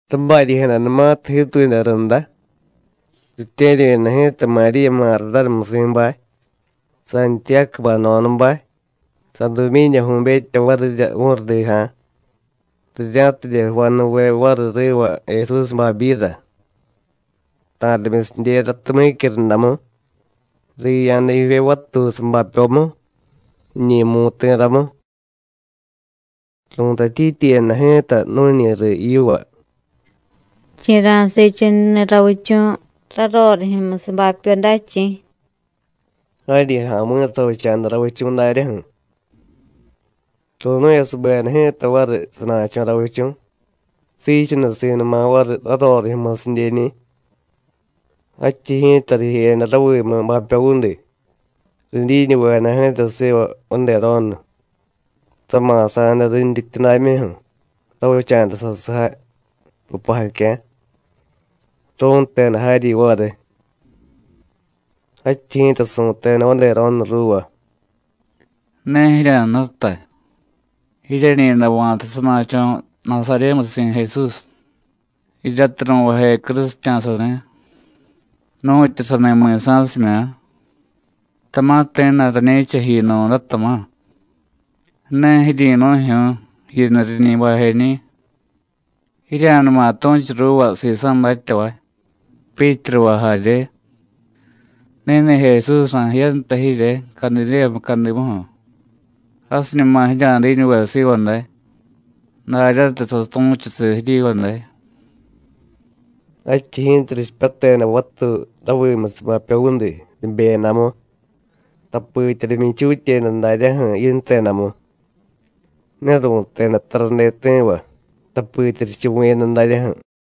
Rabaryi̱jadanumatiy jiituyada runda, ritye̱ryu̱yada ji̱ta Maríya Mardánamusi̱bay, Santiyácubay jno̱dabay, Sadumyídyaju̱betya varirya vu̱rudija̱, rirya̱tidye jvanuve variy riva Jesús babyira. Ta̱rimyusidyera tumyícyu rundamu, riya̱da jivye vatuy sabapyomu, jiñi̱ mu̱ti̱ramu. Ru̱tatyityiyada ji̱ta nu̱ñi riy yiva: “¿Chi̱ ra̱siichununi̱ ravichu̱ rarorijyu̱musiy bapyo day, chi̱?” Jaryi ja̱mi̱ savicha̱da ravichu̱ daryaju̱. ¡Ru̱nu̱yasubeda ji̱ta variy sana̱cho̱ ravichu̱, siichunusi̱numa variy rarorijyu̱musidyeñi̱! Jadchiy ji̱ta rijeyada ravimu bapyovudi, ridyiñuvejada ji̱ta siva vadero̱nu, sama̱sa̱da rintyityudamyuju̱, ravicha̱da sasujay pupajacya̱. Ru̱nteda jaryi variy. Jadchiy ji̱ta su̱teda vadero̱nu ruuva: “Ne jirya̱jnutay. Jiryeñi̱day va̱ta sana̱cho̱ Nasaryémusi̱ Jesús, jiryatiy ru̱vaje crusitya̱sani̱. Nu̱tyu sani mi̱sa̱simya̱, tama̱ ti̱jna̱y rañi̱cha jiyunu̱day, tama̱. Ne jiryi̱nu̱jyu̱ú̱, jiyuni̱ riñi bajeñi̱. Jirya̱numa tu̱chu ruuva sisa̱ datyavay, Pyítruva jarye: Ni̱ni̱ Jesús ra̱jiyanta jirye Cadidéya mucadimuju̱. Jasiñuma jirya̱diñuve siva day, daryatiy satu̱chusiy jiryiva day.” Jadchiy ji̱ta richipyateda vatuy ravimusiy bapyovudi, ribeyadamu, tapitya rimyichutyeda daryaju̱ yintedamu. Ne ru̱teda tarade ti̱va, tapitya richuvu̱yada daryaju̱.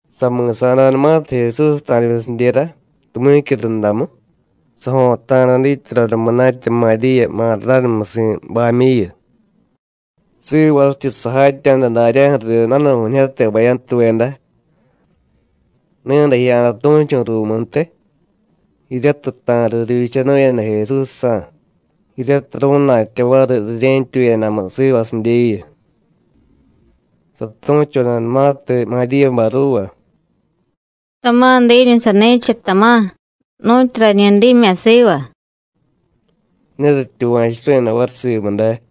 Sami̱sa̱danumatiy Jesús ta̱rimyusidyera, tumyícyu rundamu, sajo̱ta̱da dityadoda munatya Maríya Mardánamusi̱bamyuyu, sivasityi sajatya̱da daryaju̱riy danu̱ju̱ñijyate bayantuveda. Ni̱day jiya̱da tu̱chu̱ ruumuntiy, jiryatiy ta̱riy rivyichanu̱yada Jesúsjsa̱, jiryatiy ru̱na̱tya variy rirye̱ntyuyadamu sivasidyeyu. Satu̱chodanumatiy Maríyabay ruuva: “Tama̱ diiñu sani̱cha, tama̱, nu̱tyu rañi dimya̱ siva,” ne rityuva̱churu̱yada variy simu day.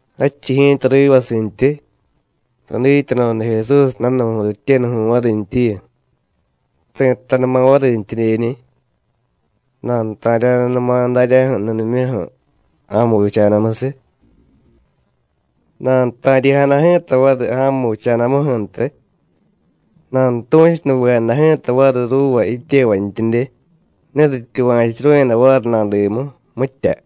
Jadchiy ji̱ta rivasintyi, sadityadoda Jesús danu̱ju̱y rityenuju̱y varintyiyu, ti̱jtanuma varintyidyeñi̱. Nanuta̱rya̱danuma daryaju̱ nudimyuju̱, ja̱mu vicha̱damusiy. Nanuta̱ryi̱jada ji̱ta variy ja̱mu vicha̱damuju̱ntiy, nanutu̱chunuvejada ji̱ta variy ruuva jityevantyidye, ne rityuva̱churu̱yada variy nadimu, mitya.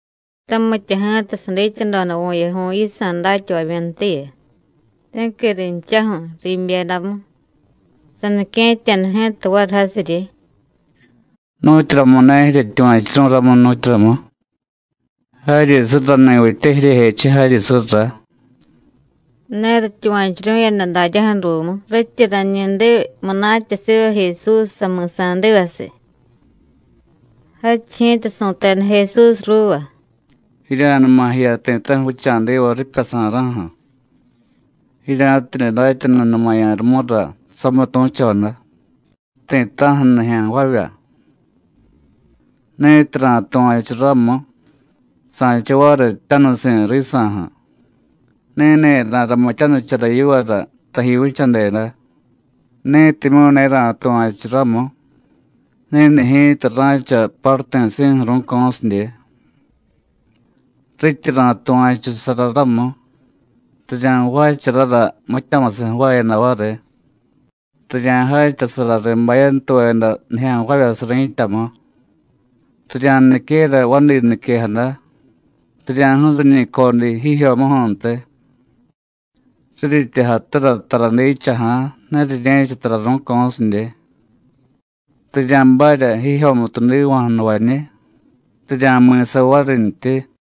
Tamitya ji̱ta sadityadoda vu̱yaju̱y yisa̱ datyavamyuntiyu, ti̱qui rinchaju̱, riibyedamu. Sanique̱tya̱da ji̱ta variy jasiryi: “¿Nu̱tyuramumu̱y ne jiryetyuva̱chu̱ru̱y ramu, nu̱tyuramu? ¡Jaryi surrani̱vitye jiryejechiy jaryi surra!” Ne rityuva̱churu̱yada daryaju̱ ruumu, rityi rañi diy munatya siva Jesús sami̱sa̱divasiy. Jadchiy ji̱ta su̱teda Jesús ruuva: “Jirya̱numa jiya ti̱ta̱ju̱ vicha̱diva ripyasa̱ra̱ju̱, jirya̱tidye datyanunumaya̱ rumura samitu̱choda, ti̱ta̱ju̱ nijya̱nvavya. Ni̱tiy ra̱tuva̱chu ramu, sa̱cha variy jtyanusi̱ risa̱ju̱, ni̱ni̱ ra̱ramityanichara yivara taji vichadeda. Ni̱timyu̱ ne ra̱tuva̱chu ramu, ni̱ni̱ ji̱ta ra̱cha paruti̱si̱ju̱ ru̱co̱sidye. Rityi ra̱tuva̱chusara ramu, rirya̱jvaacharara mityamusiy jvaayada variy. Rirya̱jatyasara riy bayantuveda nijya̱nvavyasiy ri̱tyamu, rirya̱niquera vadi niquejada, rirya̱ju̱riñi̱ codiy jijyomuju̱ntiy. Riryityi jatura tara diichaja̱, ne rirye̱cha tara ru̱co̱sidye; rirya̱barya jijyomutu jdiva̱jnuvañiy, rirya̱mi̱sa varintyi.”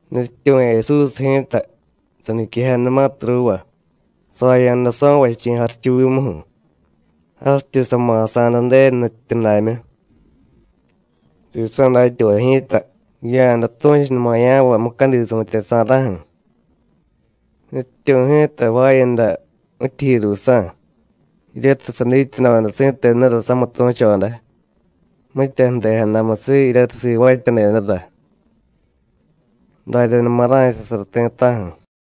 Nutyityu̱ Jesús ji̱ta, saniquejadanumatiy ruuva, saya̱da so̱vachi̱ jarichuvimuju̱, jasityi sama̱sa̱da Ju̱denu nutyityudamyu. Sisa̱ datyavay ji̱ta jiya̱da tu̱chunumaya̱vay mucadi su̱tyeryasa̱ra̱ju̱. Nutyityu̱ ji̱ta jvaayada mityijyi ruusa̱, jiryatiy sadityadoda si̱tenura samitu̱choda, mitya ju̱dejadamusiy jiryatiy sivaatyadedara. Daryanuma ra̱chasara ti̱ta̱ju̱.